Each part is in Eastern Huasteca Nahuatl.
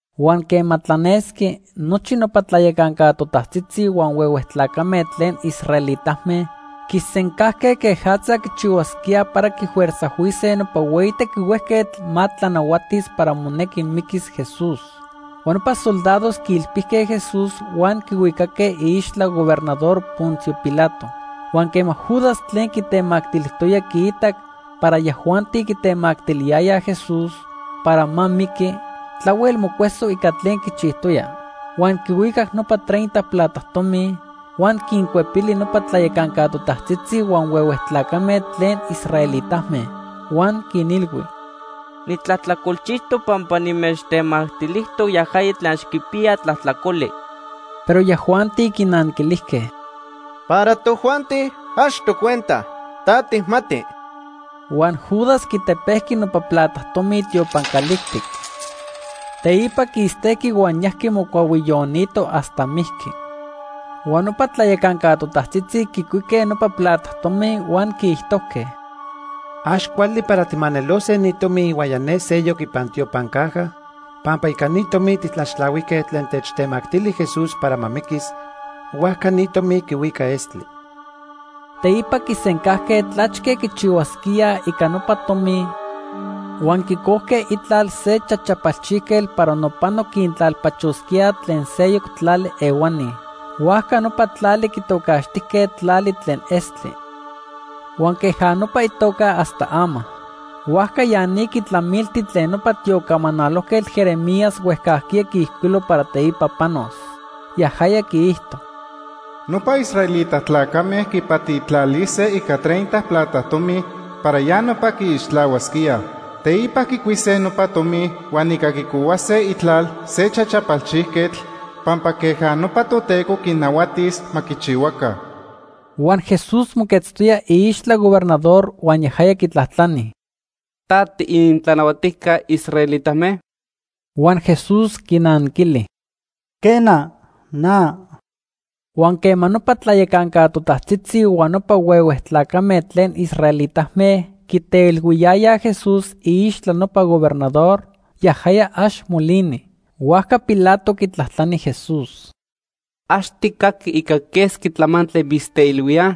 Huan quema tlanesqui, nochi nopa tlayacanca totajtzitzi huan huehue tlacame tlen israelitame quisencajque quejatza quichihuasquíaj para quifuerzajhuise nopa hueyi tequihuejquetl ma tlanahuatis para monequi miquis Jesús. Huan nopa soldados quiilpijque Jesús huan quihuicaque iixtla gobernador Poncio Pilato. Huan quema Judas tlen quitemactilijtoya quiitac para yajuanti quitemactiliyayaj Jesús para ma miqui, tlahuel mocueso ica tlen quichijtoya. Huan quihuicac nopa treinta plata tomi, huan quincuepili nopa tlayacanca totajtzitzi huan huehue tlacame tlen israelitame. Huan quinilhui: ―Nitlajtlacolchijtoc pampa nimechtemactilijtoc yajaya tlen ax quipiya tlajtlacoli. Pero yajuanti quinanquilijque: ―Para tojuanti ax tocuenta. Ta tijmati. Huan Judas quitepejqui nopa plata tomi tiopan calijtic. Teipa quistejqui huan yajqui mocuahuiyonito hasta mijqui. Huan nopa tlayacanca totajtzitzi quicuique nopa plata tomi huan quiijtojque: ―Ax cuali para tijmanelose ni tomi ihuaya ne seyoc ipan tiopan caja pampa ica ni tomi tijtlaxtlahuijque tlen techtemactili Jesús para ma miquis, huajca ni tomi quihuica estli. Teipa quisencajque tlachque quichihuasquíaj ica nopa tomi huan quicojque itlal se chachapalchijquetl para nopano quintlalpachosquíaj tlen seyoc tlali ehuani. Huajca nopa tlali quitocaxtijque Tlali tlen Estli. Huan queja nopa itoca hasta ama. Huajca ya ni quitlamilti tlen nopa tiocamanalojquetl Jeremías huejcajquiya quiijcuilo para teipa panos. Yajaya quiijto: “Nopa israelita tlacame quipatitlalise ica treinta plata tomi para ya nopa quiixtlahuasquíaj. Teipa quicuise nopa tomi huan ica quicohuase itlal se chachapalchijquetl pampa queja nopa Toteco quinnahuatis ma quichihuaca.” Huan Jesús moquetztoya iixtla gobernador huan yajaya quitlajtlani: ―¿Ta tiinintlanahuatijca israelitame? Huan Jesús quinanquili: ―Quena, na. Huan quema nopa tlayacanca totajtzitzi huan nopa huehue tlacame tlen israelitame quiteilhuiyayaj Jesús iixtla nopa gobernador, yajaya ax molini. Huajca Pilato quitlajtlani Jesús: ―¿Ax tijcaqui ica quesqui tlamantli mitzteilhuíaj?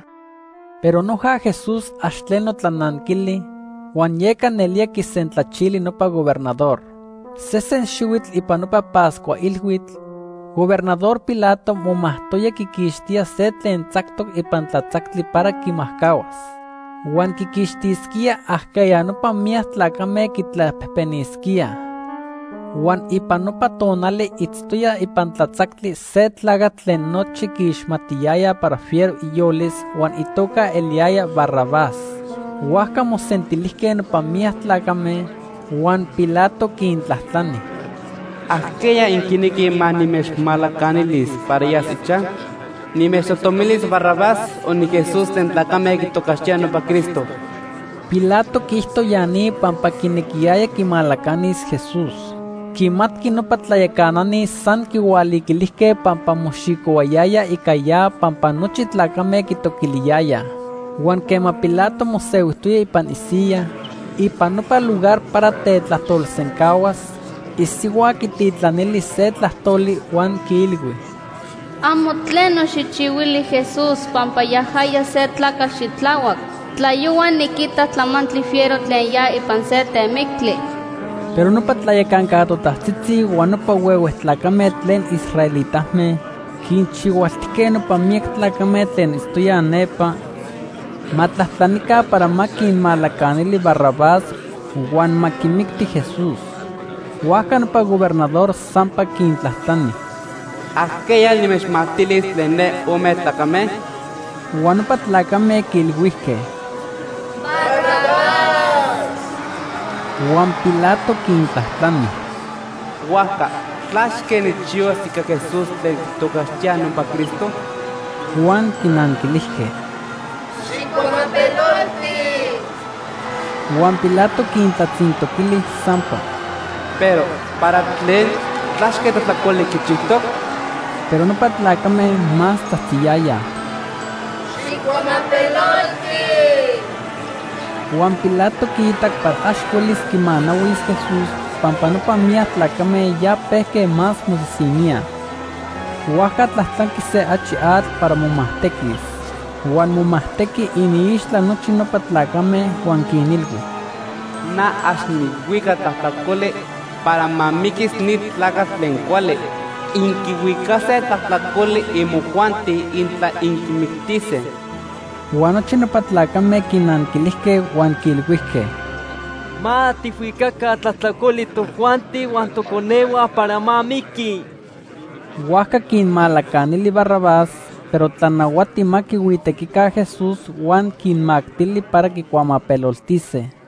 Pero noja Jesús ax tleno tlananquili, huan yeca nelía quisentlachili nopa gobernador. Sesen xihuitl ipan nopa Pascua ilhuitl, Gobernador Pilato momajtoyaya quiquixtía se tlen tzactoc ipan tlatzactli para quimajcahuas. Huan quiquixtisquíaj ajqueya nopa miyac tlacame quitlapejpenisquíaj. Huan ipan nopa tonali itztoya ipan tlatzactli se tlacatl tlen nochi quiixmatiyayaj para fiero iyolis huan itoca eliyaya Barrabás. Huajca mosentilijque nopa miyac tlacame, huan Pilato quintlajtlani: ―¿Ajqueya inquinequij ma nimechmalacanilis para yas ichaj? ¿Nimechtojtomilis Barrabás o ni Jesús tlen tlacame quitocaxtíaj nopa Cristo? Pilato quiijto ya ni pampa quinequiyaya quimalacanis Jesús. Quimatqui nopa tlayacanani san quihualiquilijque pampa moxicohuayayaj ica ya pampa nochi tlacame quitoquiliyayaj. Huan quema Pilato mosehuijtoya ipan isiyaj ipan nopa lugar para tetlajtolsencahuas, isihua quititlanili se tlajtoli huan quiilhui: “Amo tleno xijchihuili Jesús pampa yajaya se tlacatl xitlahuac. Tlayohua niquitac tlamantli fiero tlen ya ipan se temictli.” Pero nopa tlayacanca totajtzitzi huan nopa huehue tlacame tlen israelitame quinchihualtijque nopa miyac tlacame tlen itztoyaj nepa ma tlajtlanica para ma quinmalacanili Barrabás huan ma quimicti Jesús. Huajca nopa gobernador sampa quintlajtlani: ―¿Ajqueya nimechmactilis tlen ne ome tlacame? Huan nopa tlacame quiilhuijque: ―Barrabás. Huan Pilato quintlajtlani: ―Huajca ¿tlachque nijchihuas ica Jesús tlen quitocaxtíaj nopa Cristo? Huan quinanquilijque: ―Xijcuamapelolti. Huan Pilato quintlatzintoquili sampa: ―Pero ¿para tlen? ¿Tlachque tlajtlacoli quichijtoc? Pero nopa tlacame más tzajtziyayaj: ―Xijcuamapelolti. Huan Pilato quiitac para ax huelis quimanahuis Jesús pampa nopa miyac tlacame ya pejque más mosisiníaj. Huajca tlajtlanqui se achi atl para momajtequis. Huan momajtejqui iniixtla nochi nopa tlacame huan quinilhui: ―Na ax nijhuica tlajtlacoli para ma miquis ni tlacatl tlen cuali. Inquihuicase tlajtlacoli imojuanti intla inquimictise. Huan nochi nopa tlacame quinanquilijque huan quiilhuijque: ―Ma tijhuicaca tlajtlacoli tojuanti huan toconehua para ma miqui. Huajca quinmalacanili Barrabás, pero tlanahuati ma quihuitequica Jesús huan quinmactili para quicuamapeloltise.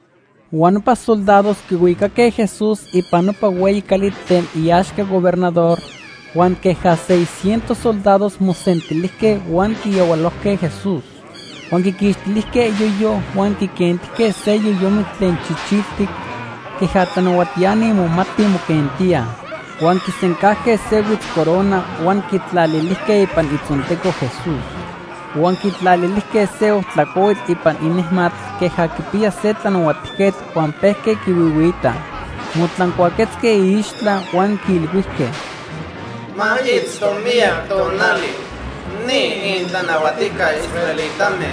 Huan nopa soldados quihuicaque Jesús ipan nopa hueyi cali tlen iaxca gobernador, huan queja seiscientos soldados mosentilijque huan quiyahualojque Jesús. Huan quiquixtilijque iyoyo huan quiquentijque se yoyomitl tlen chichiltic queja tlanahuatiani momatij moquentíaj. Huan quinsencajque se huitzcorona huan quitlalilijque ipan itzonteco Jesús. Huan quitlalilijque se ojtla cuahuitl ipan inejmatl queja quipiya se tlanahuatijquetl huan pejque quihuihuiitaj. Motlancuaquetzque iixtla huan quiilhuijque: ―¡Ma itzto miyac tonali ni inintlanahuatijca israelitame!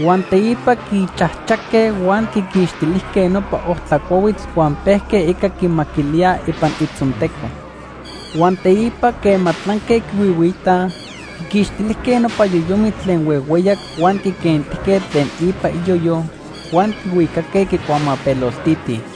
Huan teipa quichajchaque huan quiquixtilijque nopa ojtla cuahuitl huan pejque ica quimaquilíaj ipan itzonteco. Huan teipa quema tlanque quihuihuiitaj, quiquixtilijque nopa yoyomitl tlen huehueyac huan quiquentijque tlen ipa iyoyo huan quihuicaque quicuamapeloltitij.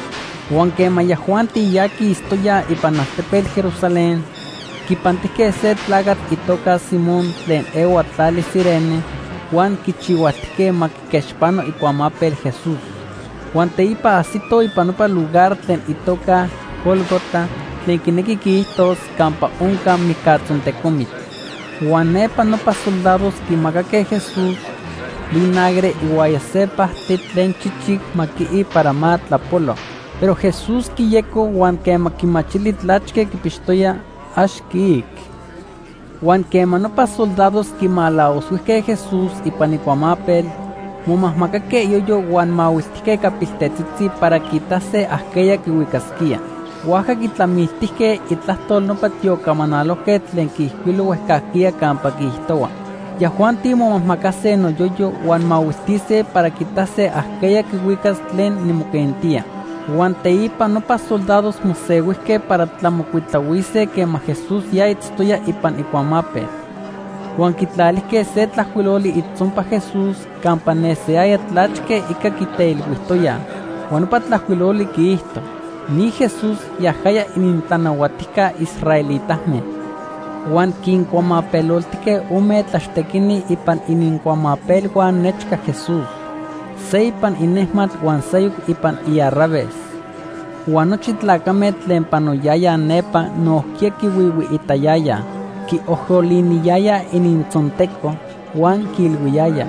Huan quema yajuanti ya quistoyaj ipan altepetl Jerusalén, quipantijque se tlacatl itoca Simón tlen ehua tlali Cirene huan quichihualtijque ma quiquechpano icuamapel Jesús. Huan teipa ajsitoj ipan nopa lugar tlen itoca Gólgota (tlen quinequi quiijtos “Campa Onca Mijcatzontecomitl”). Huan nepa nopa soldados quimacaque Jesús vinagre ihuaya se pajtli tlen chichic ma quii para ma tlapolo. Pero Jesús quiyeco huan quema quimachili tlachque quipixtoya, ax quiic. Huan quema nopa soldados quimalavoshuijque Jesús ipan icuamapel, momajmacaque iyoyo huan mahuiltijque ica piltetzitzi para quiitase ajqueya quihuicasquía. Huajca quitlamiltijque itlajtol nopa tiocamanalojquetl tlen quiijcuilo huejcajquiya campa quiijtohua: “Yajuanti momajmacase noyoyo huan mahuiltise para quiitase ajqueya quihuicas tlen nimoquentía.” Huan teipa nopa soldados mosehuijque para tlamocuitlahuise quema Jesús ya itztoya ipan icuamapel. Huan quitlalijque se tlajcuiloli itzonpac Jesús campa nesiyaya tlachque ica quiteilhuijtoyaj. Huan nopa tlajcuiloli quiijto: NI JESÚS, YAJAYA ININTLANAHUATIJCA ISRAELITAME. Huan quincuamapeloltijque ome tlaxtequini ipan inincuamapelhua nechca Jesús. Se ipan inejmatl huan seyoc ipan iarraves. Huan nochi tlacame tlen panoyayaj nepa nojquiya quihuihuiitayayaj. Quiojoliniyayaj inintzonteco, huan quiilhuiyayaj: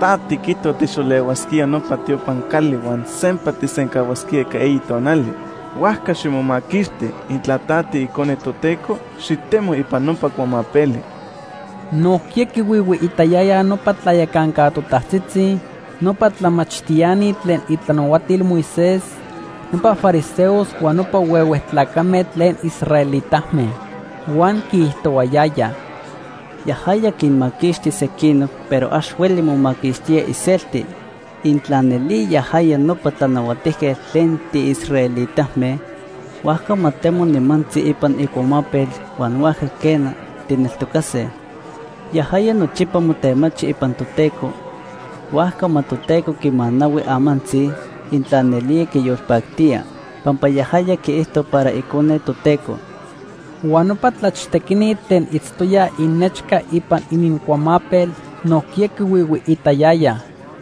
―Ta tiquijto tijxolehuasquía nopa tiopan cali huan sampa tijsencahuas ica eyi tonali. Huajca ximomaquixti. Intla ta tiIcone Toteco, xitemo ipan nopa cuamapeli. Nojquiya quihuihuiitayayaj nopa tlayacanca totajtzitzi, nopa tlamachtiani tlen itlanahuatil Moisés, nopa fariseos huan nopa huehue tlacame tlen israelitame. Huan quiijtohuayayaj: ―Yajaya quinmaquixti sequinoc pero ax hueli momaquixtía iselti. Intla nelía yajaya nopa tlanahuatijquetl tlen tiisraelitame, huajca ma temo nimantzi ipan icuamapel huan huajca, quena, tijneltocase. Yajaya nochipa motemachi ipan Toteco, huajca ma Toteco quimanahui amantzi, intla nelía quiyolpactía. Pampa yajaya quiijto para Icone Toteco. Huan nopa tlachtequini tlen itztoyaj inechca ipan inincuamapel, nojquiya quihuihuiitayayaj.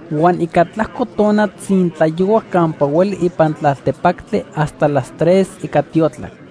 Huan ica tlajco tona tzintlayohuac campa hueli ipan tlaltepactli hasta las tres ica tiotlac.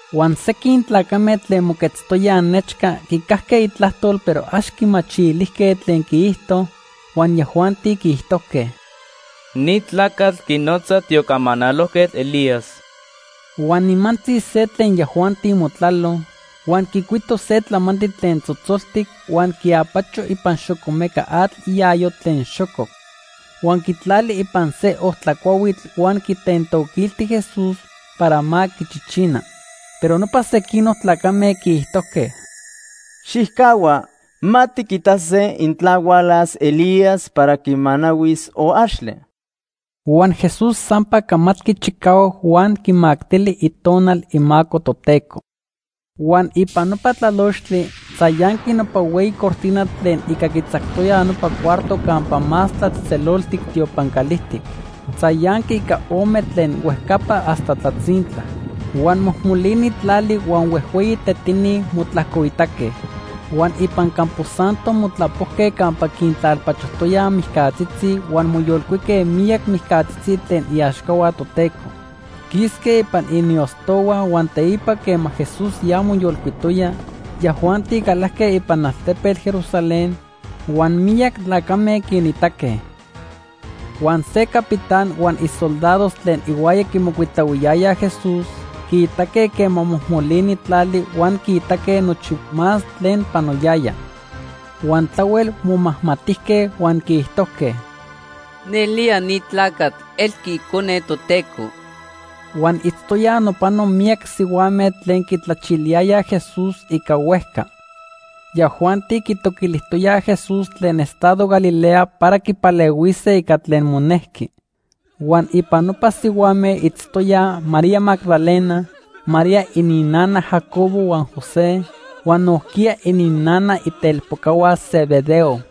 Huan sequin tlacame tlen moquetztoyaj nechca quicajque itlajtol pero ax quimachilijque tlen quiijto, huan yajuanti quiijtojque: ―Ni tlacatl quinotza tiocamanalojquetl Elías. Huan nimantzi se tlen yajuanti motlalo, huan quicuito se tlamantli tlen tzotzoltic huan quiapacho ipan xocomecatl iayo tlen xococ. Huan quitlali ipan se ojtla cuahuitl huan quitentoquilti Jesús para ma quichichina. Pero nopa sequinoc tlacame quiijtojque: ―Xijcahua. Ma tiquitase intla hualas Elías para quimanahuis o axtle. Huan Jesús sampa camatqui chicahuac huan quimactili Itonal imaco Toteco. Huan ipan nopa tlalochtli, tzayanqui nopa hueyi cortina tlen ica quitzactoya nopa cuarto campa Más Tlatzejtzeloltic tiopan calijtic. Tzayanqui ica ome tlen huejcapa hasta tlatzintla. Huan mojmolini tlali huan huejhueyi tetini motlajcoitaque. Huan ipan campo santo motlapojque campa quintlalpachojtoyaj mijcatzitzi huan moyolcuique miyac mijcatzitzi tlen iaxcahua Toteco. Quisque ipan iniostohua huan teipa quema Jesús ya moyolcuitoya, yajuanti calajque ipan altepetl Jerusalén huan miyac tlacame quinitaque. Huan se capitán huan isoldados tlen ihuaya quimocuitlahuiyayaj Jesús quiitaque quema mojmolini tlali huan quiitaque nochi más tlen panoyaya. Huan tlahuel momajmatijque huan quiijtojque: ―Nelía ni tlacatl elqui Icone Toteco. Huan itztoyaj nopano miyac sihuame tlen quitlachiliyayaj Jesús ica huejca. Yajuanti quitoquilijtoyaj Jesús tlen estado Galilea para quipalehuise ica tlen monejqui. Huan ipan nopa sihuame itztoyaj María Magdalena, María ininnana Jacobo huan José, huan nojquiya ininnana itelpocahua Zebedeo.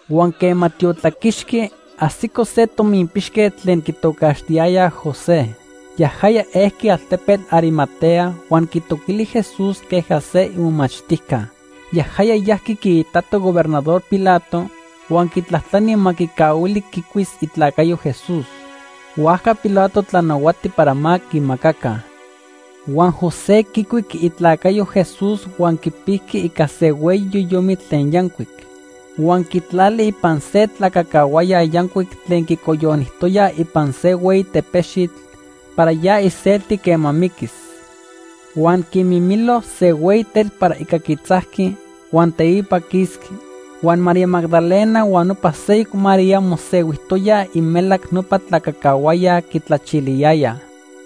Huan quema tiotlaquixqui, ajsico se tominpixquetl tlen quitocaxtiyayaj José. Yajaya ejqui altepetl Arimatea huan quitoquili Jesús queja se imomachtijca. Yajaya yajqui quiitato gobernador Pilato huan quitlajtlani ma quicahuili quicuis itlacayo Jesús. Huajca Pilato tlanahuati para ma quimacaca. Huan José quicuic itlacayo Jesús huan quipijqui ica se hueyi yoyomitl tlen yancuic. Huan quitlali ipan se tlacacahuaya yancuic tlen quicoyonijtoya ipan se hueyi tepexitl para ya iselti quema miquis. Huan quimimilo se hueyi tetl para ica quitzajqui, huan teipa quisqui. Huan María Magdalena huan nopa seyoc María mosehuijtoyaj imelac nopa tlacacahuaya quitlachiliyayaj.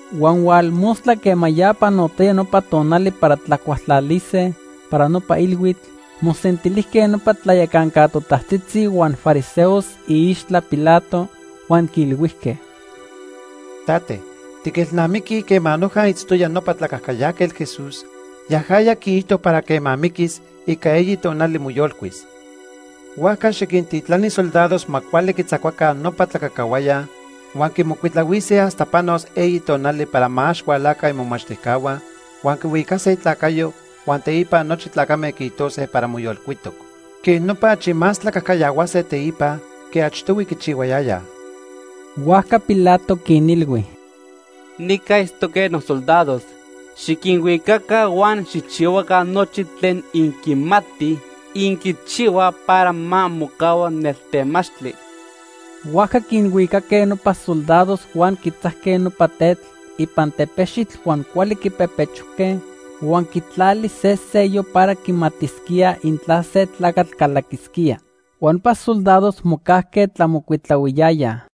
Huan hualmostla quema ya panotoya nopa tonali para tlacualtlalise para nopa ilhuitl, mosentilijque nopa tlayacanca totajtzitzi huan fariseos iixtla Pilato, huan quiilhuijque: ―Tate, tiquilnamiquij quema noja itztoya nopa tlacajcayajquetl Jesús, yajaya quiijto para quema miquis, ica eyi tonali moyolcuis. Huajca xiquintitlani soldados ma cuali quitzacuaca nopa tlacacahuaya huan quimocuitlahuise hasta panos eyi tonali para ma ax hualaca imomachtijcahua huan quihuicase itlacayo huan teipa nochi tlacame quiijtose para moyolcuitoc. Quej nopa achi más tlacajcayahuase teipa que achtohui quichihuayaya. Huajca Pilato quinilhui: ―Nica itztoque nosoldados. Xiquinhuicaca huan xijchihuaca nochi tlen inquimatij inquichihuaj para ma mocahua neltemachtli. Huajca quinhuicaque nopa soldados huan quitzajque nopa tetl ipan tepexitl huan cuali quipepechojque huan quitlali se sello para quimatisquíaj intla se tlacatl calaquisquía. Huan nopa soldados mocajque tlamocuitlahuiyayaj.